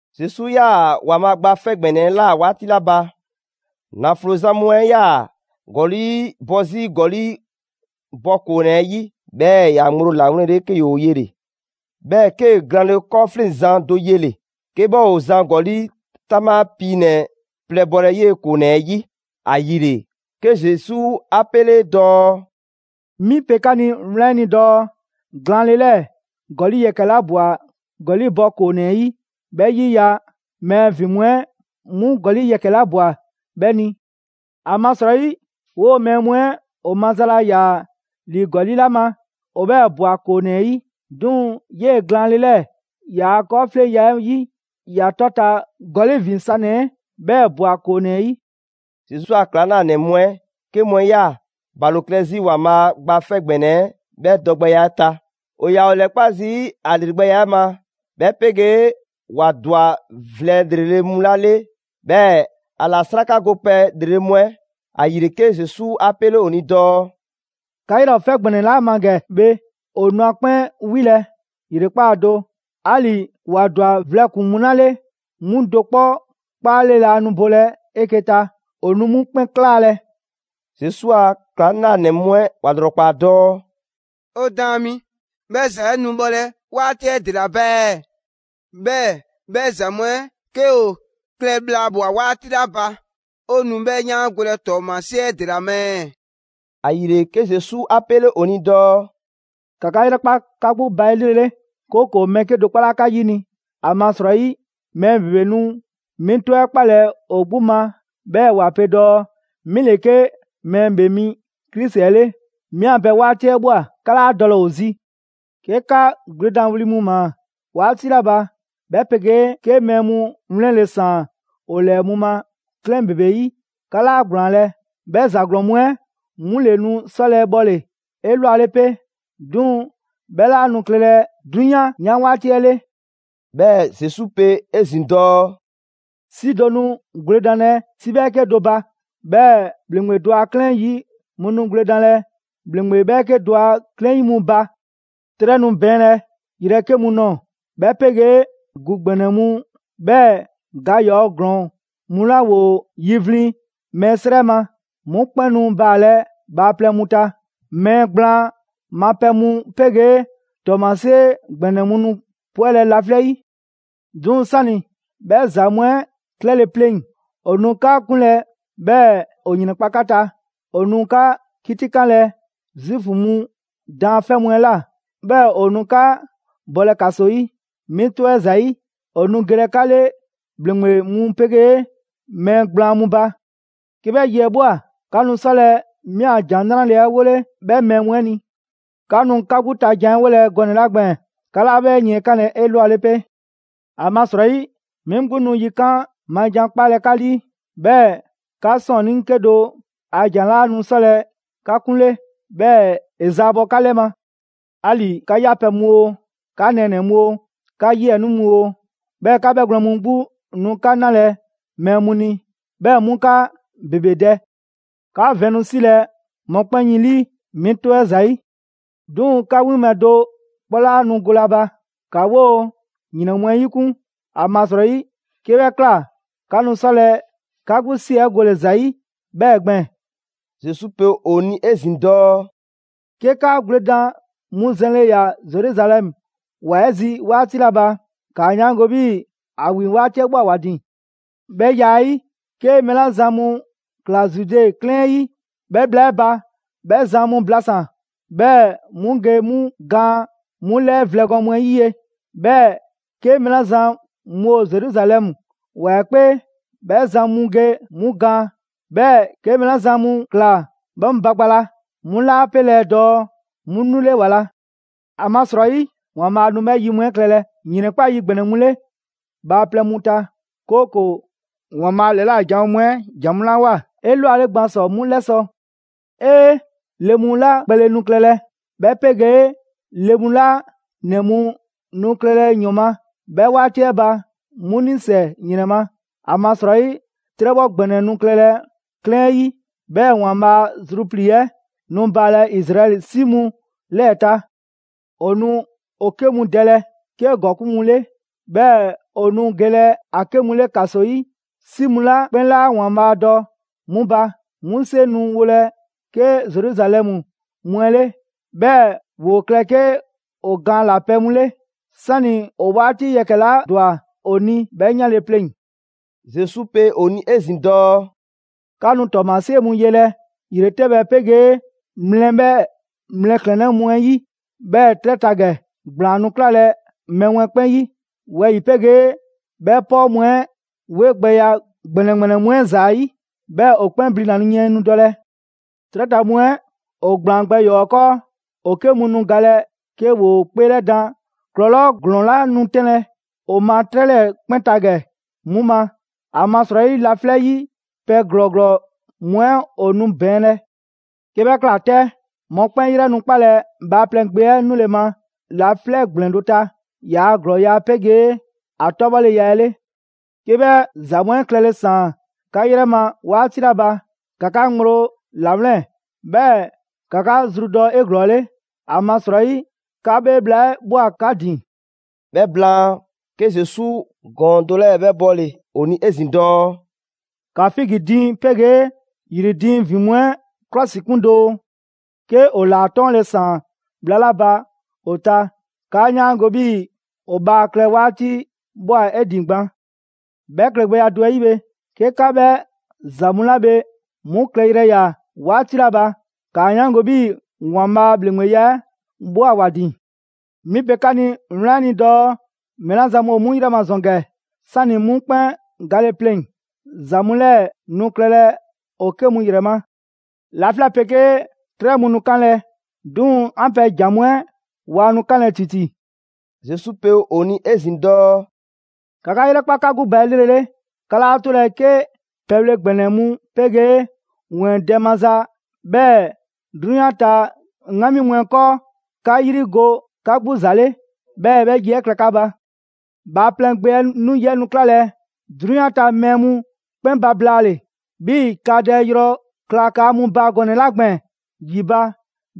Zesu 'yaa‑ ‑Waanbhaa' Gba 'Fɛ ‑Gbɛnɛ 'ɛ ꞊la 'waati 'la ba, ‑naflo zan mu 'ɛ ‑yaa ‑gɔli' bɔ 'zi ‑gɔli' bɔ ‑koonɛ 'ɛ 'yi; 'bhɛɛ‑ ‑ya ŋgblo ‑lawlɛnle 'ke ‑yoo yele‑. 'Bhɛɛ‑ 'kee‑ glaanle 'kɔɔfleŋzan do yele‑, 'ke 'bhɛ ‑o zan ‑gɔli' 'taŋbha piinɛ‑ plɛ bɔlɛ 'yee‑ ‑koonɛ 'ɛ 'yi. ‑Ayile 'ke Zesu 'a 'pele dɔɔ: «'Mi pe 'ka ni wlan 'ɛ ni dɔɔ glaanle 'lɛɛ‑ ‑gɔli' yɛkɛ‑ 'la ꞊bwa ‑gɔli' bɔ ‑koonɛ 'ɛ 'yi, 'bhɛ 'yiya‑ mɛɛ ‑vin mu 'ɛ 'mu ‑gɔli' yɛkɛ‑ 'la ꞊bwa 'bhɛ ni. ‑Amasrɔyi 'woo‑ mɛɛ mu 'ɛ ‑o maza laa ‑yaa ‑li ‑gɔli' 'la ma, ‑o 'bhɛɛ‑ ꞊bwa ‑koonɛ 'ɛ 'yi. 'Duŋ‑ 'yee‑ glaanle 'lɛɛ‑ ‑yaa' 'kɔɔfleŋya 'ɛ 'yi, ‑ya 'tɔta‑ ‑gɔli' ‑vin sanɛ‑ 'ɛ 'bhɛɛ‑ ꞊bwa ‑koonɛ 'ɛ 'yi.» Zesu a ‑klaŋlanɛ mu 'ɛ 'ke mu 'ɛ 'yaa‑ ‑balo klɛ 'zi ‑Waanbhaa' Gba 'Fɛ ‑Gbɛnɛ 'ɛ 'bhɛ dɔgbɛya 'ɛ ta. ‑O ‑yaa ‑o ‑lɛkpa' zii' ‑a ‑lregbɛya 'ɛ ma, 'bhɛ 'pegee ‑wa ‑dwa vlɛ ‑lrele' mu 'la 'le, 'bhɛɛ‑ ‑a ‑la 'srakagopɛ ‑lrele' mu 'ɛ. ‑Ayile 'ke Zesu 'a 'pele ‑o ni dɔɔ: «'Ka 'yrɛ ‑o 'fɛ ‑gbɛnɛ 'la ma ‑gɛ bhe, ‑o nu ‑a 'kpɛn 'wilɛ‑ ‑yrekpaa' do. 'Ali‑ ‑wa ‑dwa vlɛ ‑kpuŋ mu 'la 'le, 'mu do 'kpɔ 'kpaale laa nu bolɛ 'eke‑ ta. ‑O nu 'mu 'kpɛn 'klaalɛ‑.» Zesu a ‑klaŋlanɛ mu 'ɛ ‑wa ‑lrɔkpaa dɔɔ: «'O Daan mi, 'bhɛ ‑za 'ɛ nu bhɔlɛ 'waati 'ɛ ‑dela ba ɛɛ? 'Bhɛɛ‑ 'bhɛ ‑za mu 'ɛ 'ke ‑o klɛ bhla ꞊bhwa 'waati 'la ba, 'o nu 'bhɛ 'yaangolɛ ‑tɔɔmasie 'ɛ ‑dela ma ɛɛ?» ‑Ayile, 'ke Zesu 'a 'pele ‑o ni dɔɔ: «‑Ka 'ka 'yrɛkpa 'ka 'gbu ba 'elrele, 'kooko‑ mɛɛ 'kedo‑ 'kpɔ 'laa 'ka 'yini‑. ‑Amasrɔyi mɛɛ ‑bebe nu 'mi 'tɔ 'ɛ 'kpalɛ‑ ‑o 'gbu ma 'bhɛɛ‑ ‑wa pe dɔɔ: ‹'Mi ‑le 'ke Mɛɛ ‑Bhee Mi Krisi 'ɛ 'le, 'mi 'an pɛ 'waati 'ɛ ꞊bhwa!› 'Ka 'laa dɔlɛ ‑o zi. 'Ke 'ka gwledanwli mu ‑maa 'waati 'la ba, 'bhɛ 'pegee 'ke mɛɛ mu wlɛnle ‑saan ‑o ‑lɛɛ mu ma 'klɛɛn ‑bebe 'yi, 'ka 'laa ‑gblaanlɛ'; 'bhɛ ‑za ‑glɔɔn mu 'ɛ 'mu ‑le nu 'sɔlɛ‑ bhɔle‑ 'elwale 'pe. 'Duŋ‑ 'bhɛ 'laa nu klɛlɛ 'drunyan 'yan 'waati 'ɛ 'le.» 'Bhɛɛ‑ Zesu pe 'ezin‑ dɔɔ: «'Si do nu gwledanlɛ 'si 'bhɛɛke do ba; 'bhɛɛ‑ ‑bhleŋgbe do a 'klɛɛn 'yi mu nu gwledanlɛ ‑bhleŋgbe 'bhɛɛke do a 'klɛɛn 'yi mu ba. 'Trɛ nu bɛɛnlɛ yrɛ 'ke mu nɔɔ‑, 'bhɛ 'pegee ‑gu ‑gbɛnɛ mu, 'bhɛɛ‑ ga ‑yɔɔ' ‑glɔɔn mu 'la ‑woo ‑yivlin' mɛɛ 'srɛ ma, 'mu 'kpɛn nu baalɛ bhaaplɛŋ mu ta. Mɛɛ ‑gblaan ma pɛ mu 'pegee ‑tɔɔmasie ‑gbɛnɛ mu nu 'pwɛlɛ‑ laflɛ' 'yi.» «'Duŋ‑ 'sani‑ 'bhɛ ‑za mu 'ɛ klɛle pleŋ‑, ‑o nu 'ka 'kunlɛ‑ 'bhɛɛ‑ ‑o ‑yrɛnkpa' 'ka ta. ‑O nu 'ka 'kitikanlɛ Zuufu mu daanfɛ' mu 'ɛ ꞊la, 'bhɛɛ‑ ‑o nu 'ka bɔlɛ ‑kaso 'yi. 'Mi 'tɔ 'ɛ ‑zayi', ‑o nu gelɛ 'ka 'le ‑bhleŋgbe mu 'pegee mɛɛ gblaan mu ba. 'Ke 'bhɛ yi 'ɛ ꞊bhwa, 'ka nu 'sɔlɛ‑ 'mi 'an ‑Jan 'Nrale‑ 'ɛ 'wole 'bhɛ mɛɛ mu 'ɛ ni. 'Ka nu 'ka 'gbu ta jan 'ɛ 'wolɛ‑ gɔnɛ‑ 'la gbɛɛn‑, 'ka 'laa 'bhɛ yiɛnkanlɛ 'elwale 'pe. ‑Amasrɔyi 'mi 'gbu nu yikan' ma ‑jan 'kpalɛ‑ 'ka 'lii, 'bhɛɛ‑ 'ka 'sɔɔnnii 'kedo‑ a ‑jan 'laa nu 'sɔlɛ‑ 'ka 'kunle, 'bhɛɛ‑ ‑e zaabɔ 'ka 'lɛ ma. 'Ali‑ 'ka 'yapɛ‑ mu oo, 'ka nɛɛnɛ‑ mu oo, 'ka 'yiɛnii mu oo, 'bhɛɛ‑ 'ka 'bhɛgwlɛn‑ mu 'gbu nu 'ka 'nalɛ‑ mɛɛ mu ni, 'bhɛɛ‑ 'mu 'ka ‑bebe dɛ. 'Ka vɛn nu 'silɛ‑ mɔkpɛn' yin ‑lii, 'mi 'tɔ 'ɛ ‑zayi'. 'Duŋ‑ 'ka 'winbhɛ‑ do 'kpɔ 'laa nu golɛ a ba. ‑Ka 'woo‑ ‑yrɛn mu 'ɛ 'yikun: ‑amasrɔyi 'ke 'bhɛ ꞊kla, 'ka nu 'sɔlɛ‑ 'ka 'gbu 'si 'ɛ gole‑ ‑za 'yi 'bhɛɛ‑ gbɛɛn‑.» Zesu pe ‑o ni 'ezin‑ dɔɔ: «'Ke 'ka gwledan mu zɛnle ꞊ya Zeruzalɛmu ‑wa 'ɛ zi 'waati 'la ba, ‑kaa 'yaango‑ 'bhii‑ ‑a ‑wi 'waati 'ɛ ꞊bhwa ‑wa ‑din. 'Bhɛ ya 'ɛ 'yi, 'ke mɛɛ 'la zan mu ꞊kla Zude 'klɛɛn 'ɛ 'yi 'bhɛ bhla 'ɛ ba, 'bhɛ zan mu blasan‑, 'bhɛɛ‑ 'mu ge 'mu gaan 'mu 'lɛɛ vlɛ gɔɔn mu 'ɛ 'yi ye. 'Bhɛɛ‑ 'ke mɛɛ 'la zan mu ‑o Zeruzalɛmu ‑wa 'ɛ 'kpee, 'bhɛ zan mu ge 'mu gaan. 'Bhɛɛ‑ 'ke mɛɛ 'la zan mu ꞊kla 'bhɛ mu ba gba la, 'mu 'laa 'pelɛ‑ dɔɔ 'mu 'nule ‑wa la. ‑Amasrɔyi, ‑Waanbhaa' nu 'bhɛ yi mu 'ɛ klɛlɛ ‑yrɛnkpa' yi ‑gbɛnɛ mu 'le bhaaplɛŋ mu ta; 'kooko‑ ‑Waanbhaa' ‑lɛla' janwo mu 'ɛ ‑jan mu 'la ꞊woa 'elwale gban ‑sɔ 'mu 'lɛsɔ‑. 'Ee! Le mu 'la kpɛle nu klɛlɛ, 'bhɛ 'pegee le mu 'la 'nɛ mu nu klɛlɛ ‑yɔn ma 'bhɛ 'waati 'ɛ ba, 'mu 'nisɛ‑ ‑yrɛn ma! ‑Amasrɔyi 'trɛbhɔ ‑gbɛnɛ nu klɛlɛ 'klɛɛn 'ɛ 'yi, 'bhɛɛ‑ ‑Waanbhaa' a zruplii‑ 'ɛ nu baalɛ Izraɛli 'si mu 'lɛɛ‑ ta. ‑O nu ‑o 'ke mu dɛlɛ 'ke ‑gɔkuŋ' mu 'le, 'bhɛɛ‑ ‑o nu gelɛ ‑a 'ke mu 'le ‑kaso 'yi 'si mu 'la 'kpɛn 'laa ‑Waanbhaa' dɔ 'mu ba. 'Mu 'seŋ nu wolɛ 'ke Zeruzalɛmu mu 'ɛ 'le, 'bhɛɛ‑ ‑woo klɛ 'ke ‑o gaan ‑la pɛ mu 'le, 'sani ‑o 'waati yɛkɛ‑ 'la ‑dwa ‑o ni 'bhɛ 'yanle‑ pleŋ‑.» Zesu pe ‑o ni 'ezin‑ dɔɔ: «'Ka nu ‑tɔɔmasie mu yelɛ ‑yretɛbhɛ 'pegee mlɛ 'bhɛɛ‑ mlɛklɛnnɛ mu 'ɛ 'yi. 'Bhɛɛ‑ 'trɛ ta ‑gɛ, ‑gblaan nu 'klalɛ‑ mɛɛ mu 'ɛ 'kpɛn 'yi, wɛyi‑ 'pegee 'bhɛ 'pɔɔ mu 'ɛ 'wegbɛya ‑gbɛnɛ ‑gbɛnɛ mu 'ɛ ‑zayi', 'bhɛɛ‑ ‑o 'kpɛn blina‑ yiɛn nu dɔlɛ. 'Trɛ ta mu 'ɛ ‑o ‑gblaan gbɛ ‑yɔɔ' 'ɛ 'kɔɔ, ‑o 'ke mu nu galɛ 'ke ‑woo 'kpeelɛdaan ‑klɔlɔɔ' ‑glɔɔn 'la nu 'tɛnlɛ‑ ‑o ma 'trɛ 'lɛɛ‑ 'kpɛn ta ‑gɛ 'mu ma. ‑Amasrɔyi laflɛ' 'yi pɛ ‑glɔɔ ‑glɔɔ mu 'ɛ ‑o nu bɛɛnlɛ. 'Ke 'bhɛ ꞊kla 'tɛ, mɔkpɛn' 'yrɛ nu 'kpalɛ‑ Bhaaplɛŋ Gbe 'ɛ 'nule‑ ma laflɛ' ‑gblɛn do ta, ‑yaa' ‑glɔɔya' 'pegee ‑a 'tɔbhɔleya 'ɛ 'le. 'Ke 'bhɛ ‑za mu 'ɛ klɛle ‑saan 'ka 'yrɛ ma 'waati 'la ba, ‑ka 'ka ŋgblo ‑lawlɛn', 'bhɛɛ‑ ‑ka 'ka zru dɔ 'eglɔɔle, ‑amasrɔyi 'ka 'bhee bhla 'ɛ ꞊bhwa 'ka ‑din.» 'Bhɛ blaan, 'ke Zesu ‑gɔɔn do 'lɛɛ‑ 'bhɛ bɔle‑ ‑o ni 'ezin‑ dɔɔ: «‑Ka figi diiŋ 'pegee ‑yri diiŋ ‑vin mu 'ɛ 'klɔsikun doo. 'Ke ‑o ‑laa 'tɔɔnle‑ ‑saan bhla 'la ba ‑o ta, 'kaa 'yaango‑ 'bhii‑ ‑o bhaa klɛ 'waati ꞊bhwa 'e ‑din gban. 'Bhɛ klɛgbɛya do 'ɛ 'yi bhe, 'ke 'ka 'bhɛ ‑za mu 'la bhe 'mu klɛyrɛ ꞊ya 'waati 'la ba, ‑kaa 'yaango‑ 'bhii‑ ‑Waanbhaa' a ‑bhleŋgbeya 'ɛ ꞊bhwa ‑wa ‑din. 'Mi pe 'ka ni wlan 'ɛ ni dɔɔ mɛɛ 'la zan mu ‑o 'mu 'yrɛ ma ‑zɔn ‑gɛ, 'sani‑ 'mu 'kpɛn gale pleŋ‑, ‑za mu 'lɛɛ‑ nu klɛlɛ ‑o 'ke mu ‑yrɛ ma. Laflɛ' 'pegee 'trɛ mu nu kanlɛ, 'duŋ‑ 'an pɛ ‑jan mu 'ɛ waa nu 'kanlɛ‑ ‑titi.» Zesu pe ‑o ni 'ezin‑ dɔɔ: «‑Ka 'ka 'yrɛkpa 'ka 'gbu ba 'elrele! 'Ka 'laa 'tolɛ‑ 'ke pɛbhle ‑gbɛnɛ mu 'pegee ‑wɛɛn dɛ maza, 'bhɛɛ‑ 'drunyan ta 'ŋgami mu 'ɛ 'kɔɔ, 'ka 'yri go 'ka 'gbu ‑za 'le, 'bhɛɛ‑ 'bhɛ yi 'ɛ kla 'ka ba. Bhaaplɛŋ Gbe 'ɛ 'nu yi 'ɛ nu 'klalɛ‑ 'drunyan ta mɛɛ mu 'kpɛn ba blaale‑, 'bhii‑ kaadɛ yrɔ kla kaa mu ba gɔnɛ‑ 'la gbɛɛn‑ ‑yi ba,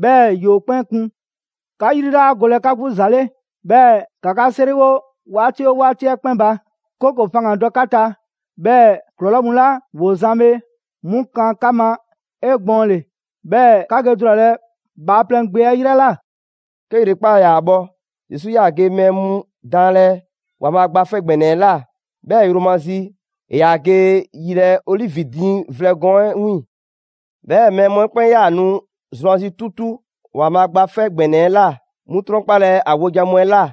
'bhɛɛ‑ ‑yoo 'kpɛn kun. 'Ka 'yri 'laa golɛ 'ka 'gbu ‑za 'le, 'bhɛɛ‑ ‑ka 'ka 'seriwo 'waati oo 'waati 'ɛ 'kpɛn ba. 'Kooko‑ faŋgandɔ 'ka ta, 'bhɛɛ ‑klɔlɔɔ' mu 'la ‑woo zan bhe, 'mu kan 'ka ma 'egbɔɔnle, 'bhɛɛ‑ 'ka ge dulalɛ Bhaaplɛŋ Gbe 'ɛ 'yrɛ ꞊la.» 'Ke ‑yrekpaa' ‑yaa bhɔ, Zesu 'yaa‑ ge mɛɛ mu daanlɛ ‑Waanbhaa' Gba 'Fɛ ‑Gbɛnɛ 'ɛ ꞊la, 'bhɛɛ‑ yromazi, ‑e ‑yaa ge yilɛ Olivi diiŋ vlɛ gɔɔn 'ɛ 'wiiŋ‑. 'Bhɛɛ‑ mɛɛ mu 'ɛ 'kpɛn 'yaa‑ nu zrwanzi 'tutu ‑Waanbhaa' Gba 'Fɛ ‑Gbɛnɛ 'ɛ ꞊la 'mu 'trɔnkpalɛ ‑a wojan mu 'ɛ ꞊la.